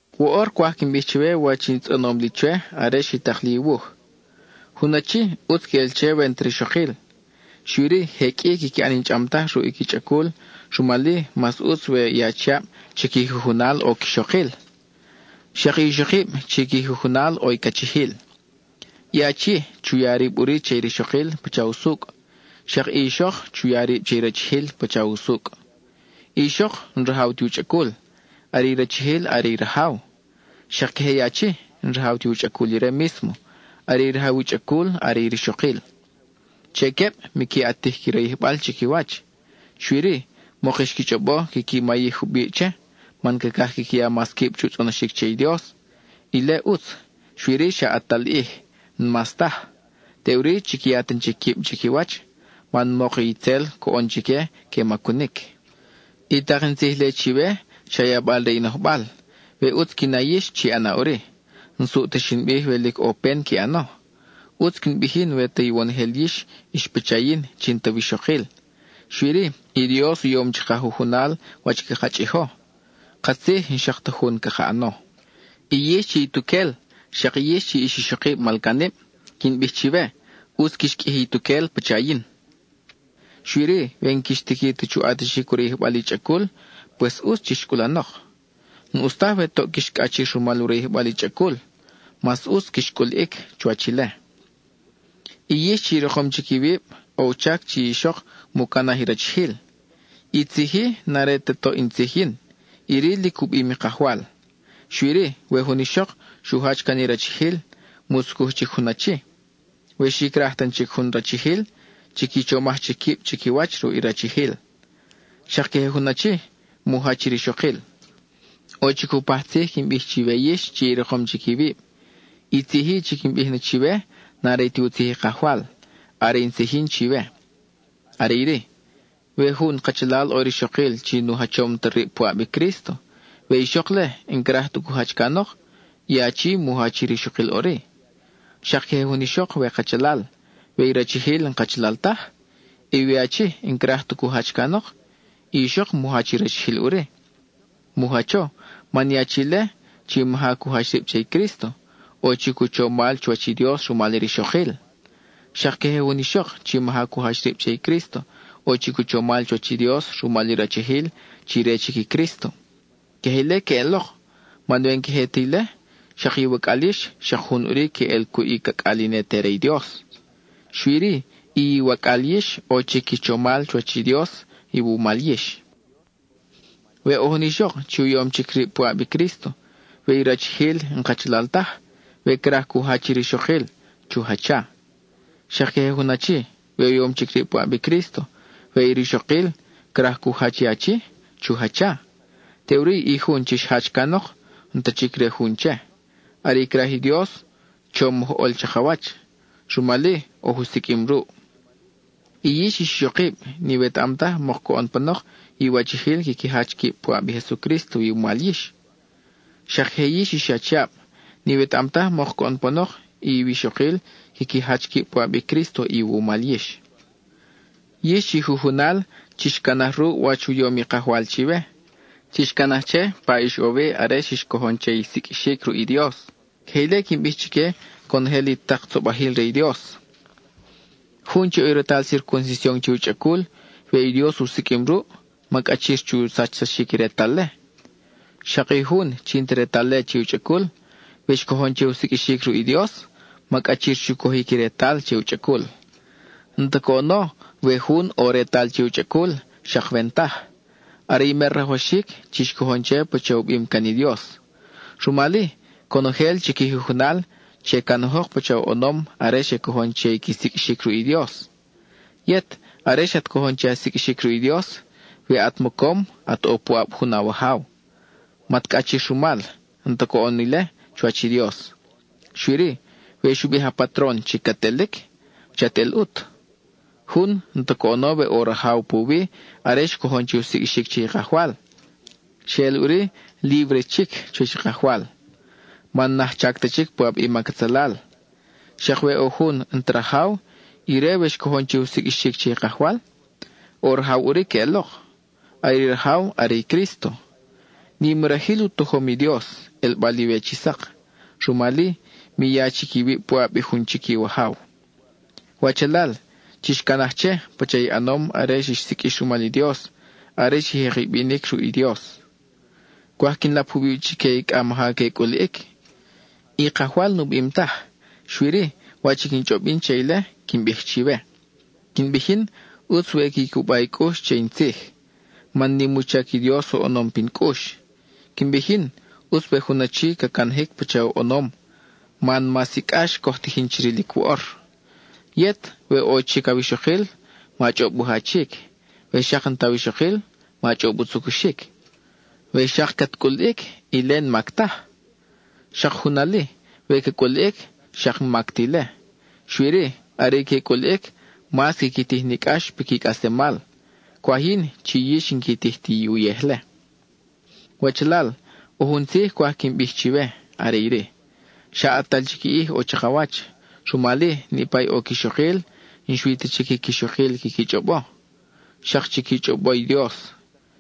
Woʼor cwaj quin bij chiwe wach i tzʼonom li chwe are xi tak li i wuj. Jun achi, ʼutz queʼel che we n-ta rixokil. Xui-ri, je qʼui quiqui ʼan i n-chʼam taj ruʼ i qui chʼacul, rumal-i, mas ʼutz we i achiab chi qui jujunal ʼo i quixokil; xak i ixokib chi qui jujunal, ʼo i cachijil. I achi chu ya rib ʼuri che i rixokil pacha usucʼ; xak i ixok chu ya rib che rachijil pacha usucʼ. I ixok, n-rajaw ti u chʼacul, are i rachijil are i rajaw; xak queje i achi, n-rajaw ti u chʼacul ire mísmo, are rajaw i u chʼacul are i rixokil. Che queb, miqui ʼatij qui rayijbal chiquiwach, xui-ri, mok xqui chʼobo quiqui mayij jubiʼ che, man cacaj quiqui ya mas quib chu tzʼonoxic che i Dios. Ile ʼutz, xui-ri, xa ʼatal ʼij, n-mas taj. Teʼuri, chiqui ya tan chic quib chiquiwach, man mok i itzel coʼon chique que macunic. I tak in tzij-le chiwe, xa yabal re i nojbal; we ʼutz qui na yix, chi ʼana ʼuri. N-suʼ ta xin bij we lic ʼo pen qui ʼano. ʼUtz quin bij yin we ta iwonojel yix ix pacha yin chi n-ta wixokil. Xui-ri, i Dios u yom chaka jujunal wach caka chʼijo; katzij n-xak ta jun caka ʼano. I yix chi ituquel, xak yix chi ix ixokib malcanib, quin bij chiwe, ʼutz quix qʼuiji ituquel pacha yin. Xui-ri, we n-quix tiqui ta chu ʼatixic u rayijbal i chʼacul, pues ʼutz chix cʼulanok. N-ʼus taj we toʼ quix cʼachir rumal u rayijbal i chʼacul; mas ʼutz quix cʼuliʼic chuwach ile. I yix chi i rikom chic iwib, ʼo u chac chi i ixok mu canaj i rachijil. I tzij-i, n-are ta toʼ in tzij yin, iri lic u bim i Kajwal. Xui-ri, we jun ixok xu jach can i rachijil, mu tzucuj chic jun achi. We xi craj tan chic jun rachijil, chiqui chomaj chic quib chiquiwach ruʼ i rachijil. Xak queje jun achi, mu jach i rixokil. ʼO chic jupaj tzij quin bij chiwe yix chi i rikom chic iwib. I tzij-i chi quin bij na chiwe n-are ti u tzij i Kajwal; are in tzij yin chiwe. Are iri: we jun kachalal ʼo rixokil chi nu jachom ta rib puʼab i Crísto, we i ixok-le n-craj ta cu jach canok, i achi mu jach i rixokil ʼuri. Xak queje jun ixok we kachalal, we i rachijil n-kachalal taj, we i achi n-craj ta cu jach canok, i ixok mu jach i rachijil ʼuri. Mu jacho, man i achi-le chi maja cu jach rib che i Crísto, ʼo chic u chomal chuwach i Dios rumal i rixokil. Xak queje jun ixok chi maja cu jach rib che i Crísto, ʼo chic u chomal chuwach i Dios rumal i rachijil chi re chic i Crísto. Queje ile queʼelok, man we n-queje ta ile, xak iwacʼal yix xak jun ʼuri queʼel cuʼ i cacʼal i ne te re i Dios. Xui-ri, i iwacʼal yix ʼo chic qui chomal chuwach i Dios iwumal yix. We ʼo jun ixok, chi u yom chic rib puʼab i Crísto, we i rachijil n-kachalal taj, we craj cu jach i rixokil, chu jacha. Xak queje jun achi, we u yom chic rib puʼab i Crísto, we i rixokil craj cu jach i achi, chu jacha. Teʼuri i jun chi xjach canok, n-ta chic re i jun che. Are i craj i Dios, chom oj ʼol chakawach, rumal-i oj u siqʼuim ruʼ. I yix ix ixokib, n-iwetaʼam taj mok coʼon panok iwachijil quiqui jach quib puʼab i Jesucrísto iwumal yix. Xak queje yix ix achiab, n-iwetaʼam taj mok coʼon panok iwixokil quiqui jach quib puʼab i Crísto iwumal yix. Yix chi jujunal, chix canaj ruʼ wach u yom i Kajwal chiwe; chix canaj che pa ix ʼo wi are xix cojon che i siqʼuixic ruʼ i Dios. Queje ile quin bij chique conojel i tak tzobajil re i Dios. Jun chi ʼo retal circuncision che u chʼacul, we i Dios u siqʼuim ruʼ, ma cʼachir chu sachsaxic i retal-le. Xak i jun chi n-ta retal-le che u chʼacul, we xcojon che u siqʼuixic ruʼ i Dios, ma cʼachir chu cojic i retal che u chʼacul. N-ta coʼono we jun ʼo retal che u chʼacul, xak we n-taj; are i mer rajwaxic, chix cojon che pacha u bim can i Dios. Rumal-i, conojel chi qui jujunal, che canajok pacha oʼonom are xe cojon che i qui siqʼuixic ruʼ i Dios. Yet, are xat cojon che a siqʼuixic ruʼ i Dios, we at mocom at ʼo puʼab jun awajaw, mat cʼachir rumal, n-ta coʼon ile chuwach i Dios. Xui-ri, we xu bij a patron chi cat elic, chat el ʼut. Jun, n-ta coʼono we ʼo rajaw puwi are xcojon che u siqʼuixic che i Kajwal; xeʼel ʼuri líbre chic chuwach i Kajwal, man n-ajchac ta chic puʼab i mac atzalal. Xak we ʼo jun n-ta rajaw, ire we xcojon che u siqʼuixic che i Kajwal, ʼo rajaw ʼuri queʼelok; are i rajaw are i Crísto. Nim i rajil u tojom i Dios, ʼelbal-iwe chi sak; rumal-i mi ya chic iwib puʼab jun chic iwajaw. Wachalal, chix canaj che, pacha i ʼanom are xix siqʼuix rumal i Dios, are xi jek i binic ruʼ i Dios. Cwaj quin lap jubiʼ chique i cʼa maja que cʼuliʼic. I Kajwal nu bim taj, xui-ri, wach i quin chʼob yin che ile, quin bij chiwe. Quin bij yin, ʼutz we qui cuba i cʼux che in tzij, man nim u chac i Dios oʼonom pin cʼux. Quin bij yin, ʼutz we jun achi ca canajic pacha oʼonom, man mas i cʼax coj tijin chi rilic woʼor. Yet, we ʼo chic awixokil, ma chʼob u jachic; we xak n-ta awixokil, ma chʼob u tzucuxic. We xak cat cʼuliʼic, ile n-mac taj. Xak jun ali, we ca cʼuliʼic, xak n-mac ta ile. Xui-ri, are i que cʼuliʼic, mas quiqui tij ni cʼax piqui cʼaslemal; cwaj yin, chi yix n-qui tij ti uyej-le. Wachalal, ʼo jun tzij cwaj quin bij chiwe, are iri: xa ʼatal chic ʼij ʼo chakawach, rumal-i, niʼpa i ʼo quixokil, n-xui ta chic i quixokil quiqui chʼobo, xak chiqui chʼobo i Dios.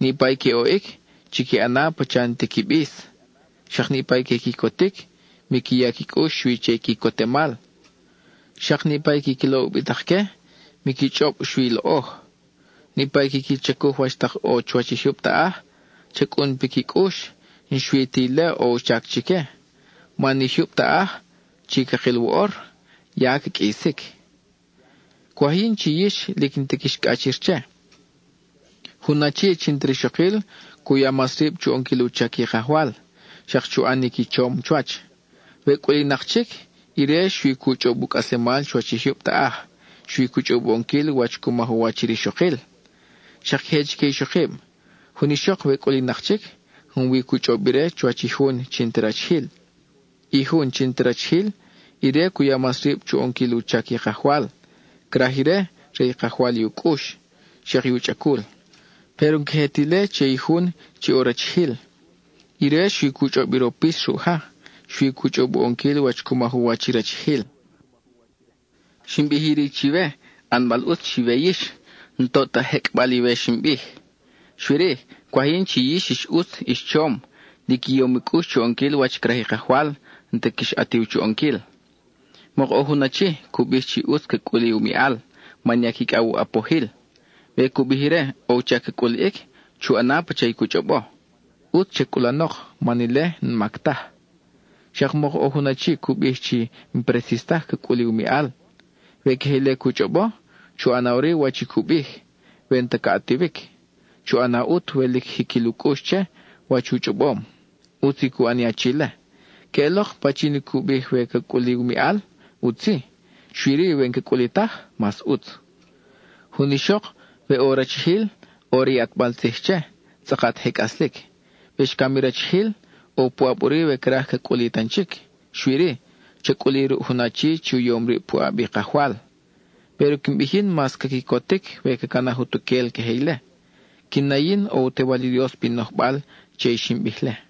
Niʼpa i que oʼic, chiqui ʼana pacha n-ti qui bis; xak niʼpa i que quicotic, miqui ya qui cʼux xui che i quicotemal; xak niʼpa i quiqui loʼ ubitak-que, miqui chʼob xui loʼoj. Niʼpa i quiqui chacuj wach tak ʼo chuwach i jyub taʼaj, cha cʼun piqui cʼux, n-xui ta ile ʼo u chac chique, man i jyub taʼaj chi cakil woʼor, ya ca qʼuisic. Cwaj yin chi yix, lic n-ta quix cʼachir che. Jun achi chi n-ta rixokil, cu ya mas rib chu ʼonquil u chac i Kajwal, xak chu ʼanic i chom chuwach. We cʼulinak chic, ire xui cu chʼob u cʼaslemal chuwach i jyub taʼaj, xui cu chʼob u ʼonquil wach cu maj u wach i rixokil. Xak queje chique ixokib: jun ixok we cʼulinak chic, junwi cu chʼob ire chuwach i jun chi n-ta rachijil. I jun chi n-ta rachijil, ire cu ya mas rib chu ʼonquil u chac i Kajwal; craj ire re i Kajwal i u cʼux, xak i u chʼacul. Péro n-queje ta ile che i jun chi ʼo rachijil; ire xui cu chʼob i ropis ruʼ ja, xui cu chʼob u ʼonquil wach cu maj u wach i rachijil. Xin bij iri chiwe, ʼanbal ʼutz chiwe yix, n-toʼ ta jecʼbal iwe xin bij. Xui-ri, cwaj yin chi yix ix ʼutz ix chom, lic i yom i cʼux chu ʼonquil wach craj i Kajwal, n-ta quix ʼatiw chu ʼonquil. Mok ʼo jun achi, cu bij chi ʼutz ca cʼuli u miʼal man ya quicʼaw u ʼapojil; we cu bij ire ʼo u chac ca cʼuliʼic, chu ʼana pacha cu chʼobo. ʼUtz cha cʼulanok, man ile n-mac taj. Xak mok ʼo jun achi cu bij chi n-presis taj ca cʼuli u miʼal. We queje ile cu chʼobo, chu ʼana ʼuri wach i cu bij, we n-ta ca ʼatiwic; chu ʼana ʼut we lic jiquil u cʼux che, wach u chʼobom. ʼUtz i cu ʼan i achi-le. Queʼelok, pachin i cu bij we ca cʼuli u miʼal, ʼutz-i, xui-ri we n-ca cʼuli taj, mas ʼutz. Jun ixok, we ʼo rachijil, ʼo re i ʼatbal tzij che, tzʼakat je cʼaslic. We xcam i rachijil, ʼo puʼab ʼuri we craj ca cʼuli tan chic; xui-ri, cha cʼuli ruʼ jun achi chi u yom rib puʼab i Kajwal. Péro quin bij yin mas ca quicotic we ca canaj utuquel queje ile. Quin na yin ʼo u Tewal i Dios pin nojbal che i xin bij-le.